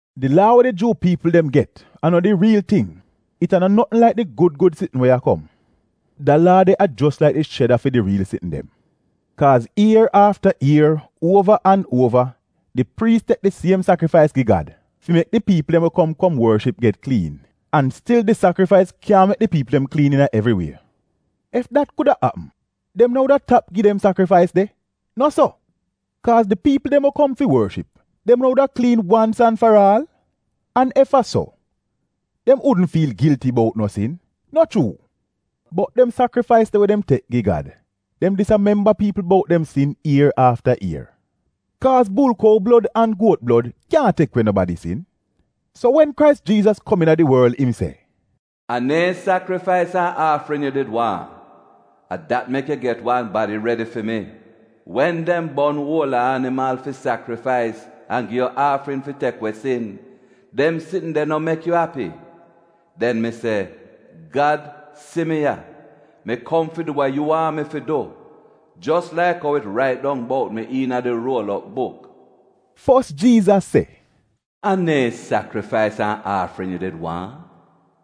Di laa we di Juu piipl dem get a no di riil ting, it a no notn laik di gud gud sitn we a kom. Da laa de a jos laik di sheda fi di riil sitn dem. Kaaz ier afta ier, uova an uova di priis tek di siem sakrifais gi Gad fi mek di piipl dem we kom kom worship get kliin, an stil di sakrifais kyaahn mek di piipl dem kliin iina evri wie. Ef dat kuda apm, dem wudn tap gi dem sakrifais de, no so? Kaaz di piipl dem we kom fi worship, dem no wuda kliin wans an faraal? An ef a so, dem wudn fiil gilti bout no sin, no chuu? Bot dem sakrifais de we dem tek gi Gad, dem dis a memba piipl bout dem sin ier afta ier. Kaaz bulkou blod an guot blod kyaahn tek we nobadi sin. So wen Krais Jiizas kom iina di worl im se, “A neehn sakrifais an aafrin yu did waahn, a dat mek yu get wan badi redi fi mi; wen dem bon uola animal fi sakrifais, an gi yu aafrin fi tek we sin, dem sitn de no mek yu api. Den mi se, ‘Gad si mi ya, mi kom fi du wa yu waahn mi fi du, jos laik ou it rait dong bout mi iina di ruol op buk.’” Fos Jiizas se, “A neehn sakrifais an aafrin yu did waahn,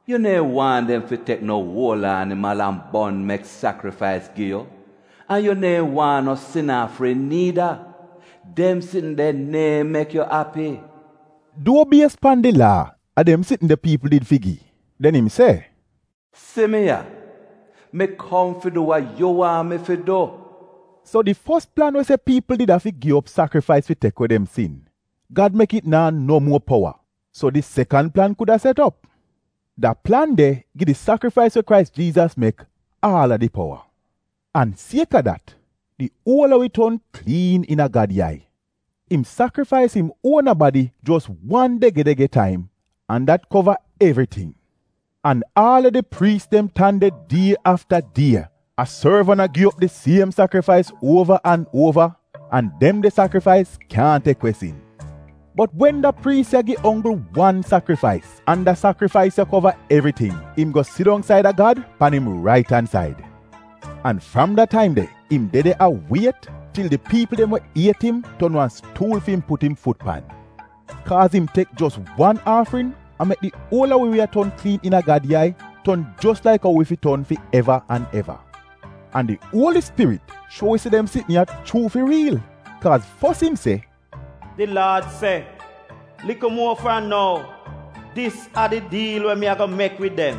yu neehn waahn dem fi tek no uola animal an bon mek sakrifais gi yu an yu neehn waahn no sin aafrin niida. Dem sitn de neehn mek yu api” — duo bies pan di laa a dem sitn de piipl did fi gi. Den im se, “Si mi ya. Mi kom fi du wa yu waahn mi fi du.” So di fos plan we se piipl did afi gi op sakrifais fi tek we dem sin, Gad mek it naa no muo powa so di sekan plan kuda set op; da plan de gi di sakrifais we Krais Jiizas mek aal a di powa. An sieka dat, di uol a wi ton kliin iina Gad yai. Im sakrifais im uona badi jos wan dege-dege taim an dat kova evriting. An aal a di priis dem tan de die afta die, a sorv an a gi op di siem sakrifais uova an uova — an dem de sakrifais kyaahn tek we sin. Bot wen da priis ya gi onggl wan sakrifais, an da sakrifais ya kova evriting, im go sidong said a Gad, pan im rait an said. An fram da taim de, im de de a wiet til di piipl dem we iet im ton wan stuul fi im put im fut pan, kaaz im tek jos wan aafrin an mek di uol a wi we a ton kliin iina Gad yai ton jos laik ou wi fi ton fi eva an eva. An di Uoli Spirit shuo wi se dem sitn ya chuu fi riil, kaaz fos im se, “Di Laad se, ‘Likl muo fram nou, dis a di diil we mi ago mek wid dem: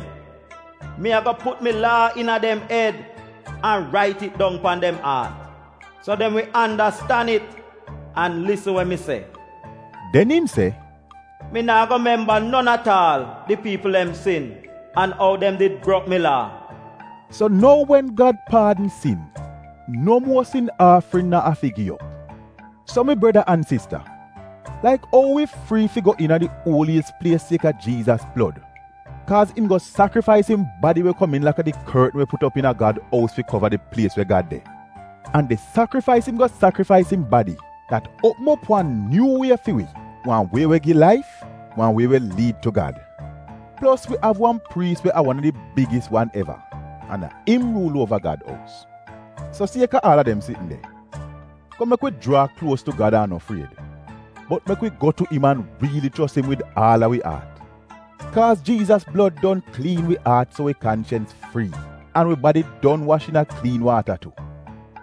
Mi ago put mi laa iina dem ed an rait it dong pan dem aat, so dem wi andastan it an lisn we mi se.’” Den im se, “Mi naa go memba non at aal di piipl dem sin an ou dem did brok mi laa.” So nou, wen Gad paadn sin, no muo sin aafrin no afi gi op. So mi breda an sista, laik ou wi frii fi go iina di Uoliyis Plies sieka Jiizas blod, kaaz im go sakrifais im badi we komiin laka di kortn we put op iina Gad ous fi kova di plies we Gad de; an di sakrifais im go sakrifais im badi, dat uopm op wan nyuu wie fi wi, wan wie we wi mek wi go wich paat laif de. Plos wi av wan priis we a wan a di bigis wan eva, an a im ruul uova Gad ous. So sieka aal a dem sitn de, kom mek wi jraa kluos tu Gad an no fried. Bot mek wi go tu im an riili chos im wid aal a wi aat. Kaaz Jiizas blod don kliin wi aat so wi kanchens frii, an wi badi don wash iina kliin waata tu.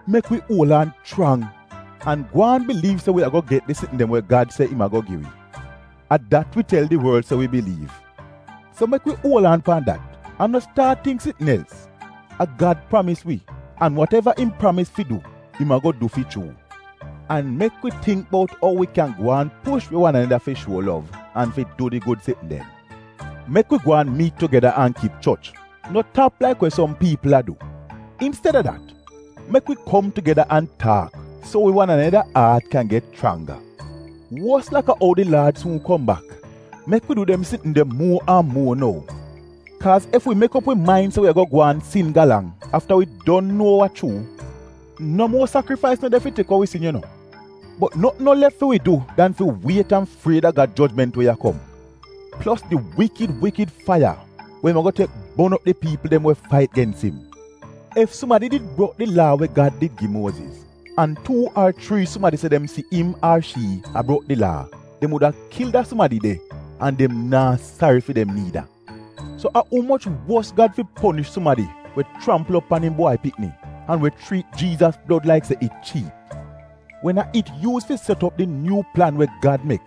Mek wi uol aan chrang an gwaan biliiv se wi ago get di sitn dem we Gad se im ago gi wi — a dat wi tel di worl se wi biliiv. So mek wi uol aan pan dat an no staat tingk sitn els. A Gad pramis wi, an wateva im pramis fi du, im ago du fi chuu. An mek wi tingk bout ou wi kyan gwaan push wi wan aneda fi shuo lov an fi du di gud sitn dem. Mek wi gwaan miit tugeda an kip choch — No tap, laik we som piipl a du. Insteda dat mek wi kom tugeda an taak so wi wan aneda aat kyan get chrangga; wos laka ou di Laad suun kom bak, mek wi du dem sitn de muo an muo nou. Kaaz ef wi mek op wi main se wi ago gwaan sin galang afta wi don nuo wa chuu, no muo sakrifais no de fi tek we wi sin yu nuo. Bot notn no lef fi wi du dan fi wiet an fried a Gad jojment we a kom plos di wikid wikid faiya we im ago tek bon op di piipl dem we fait gens im. Ef sumadi did brok di Laa we Gad did gi Muoziz, an tuu ar chrii sumadi se dem si im ar shii a brok di Laa, dem wuda kil da sumadi de an dem naa sari fi dem niida. So a umoch wos Gad fi ponish sumadi we chrampl op pan im Bwai Pikni, an we chriit Jiizas blod laik se it chiip, wen a it yuuz fi set op di nyuu plan we Gad mek?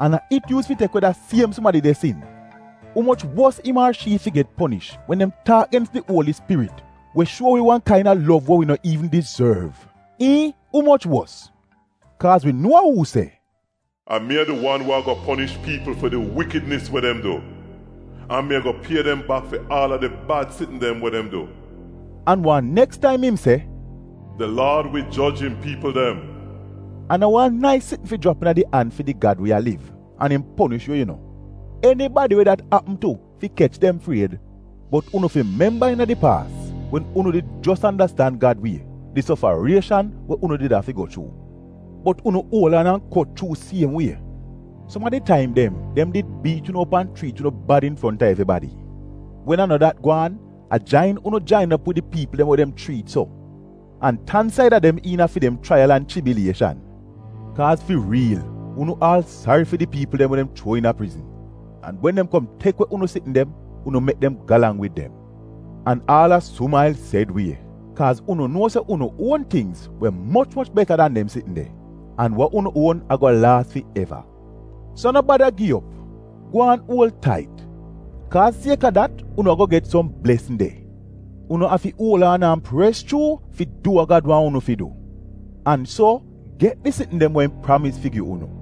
An a it yuuz fi tek we da siem sumadi de sin. Umoch wos im ar shii fi get ponish wen dem taak gens di Uoli Spirit we shuo wi wan kaina lov we wi nat iivn dizorv — iihn, umoch wos? Kaaz wi nuo a uu se, “A mi a di wan we ago ponish piipl fi di wikidnis we dem du, an mi ago pie dem bak fi aal a di bad sitn dem we dem du.” An wan neks taim im se, “Di Laad wi joj im piipl dem.” A no wan nais sitn fi jrap iina di an fi di Gad we a liv, an im ponish yu yu nuo — enibadi we dat apm tu fi kech dem fried! Bot memba iina di paas wen unu did jos andastan Gad wie, di sofarieshan we unu did afi go chuu? Bot unu uol aan an kot chuu siem wie. Som a di taim dem, dem did biit unu op an chriit unu bad infronta evribadi; wen a no dat gwaan, a jain unu jain op wid di piipl dem we dem chriit so, an tan saida dem iina fi dem chraiyal an chibilieshan. Kaaz fi riil, unu aal sari fi di piipl dem we dem chuo iina prizn. An wen dem kom tek we unu sitn dem, unu mek dem galang wid dem an aal a sumail sed wie, kaaz unu nuo se unu uon tingz we moch moch beta dan dem sitn de, an wa unu uon ago laas fi eva. So no bada gi op, gwaan uol tait, kaaz sieka dat unu ago get som blesn de! Unu afi uol aan an pres chuu fi du wa Gad waahn unu fi du, an so get di sitn dem we im pramis fi gi unu.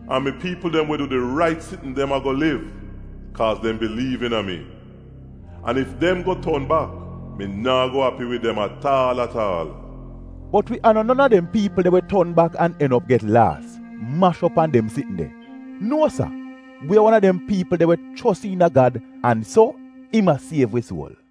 An mi piipl dem we du di rait sitn dem ago liv kaaz dem biliiv iina mi. An ef dem go ton bak mi naa go api wid dem at aal at aal. Bot wi no non a dem piipl de we ton bak an en op get laas, mash op an dem sitn de. Nuo sa, wi a wan a dem piipl de we chos iina Gad an so im a siev wi suol.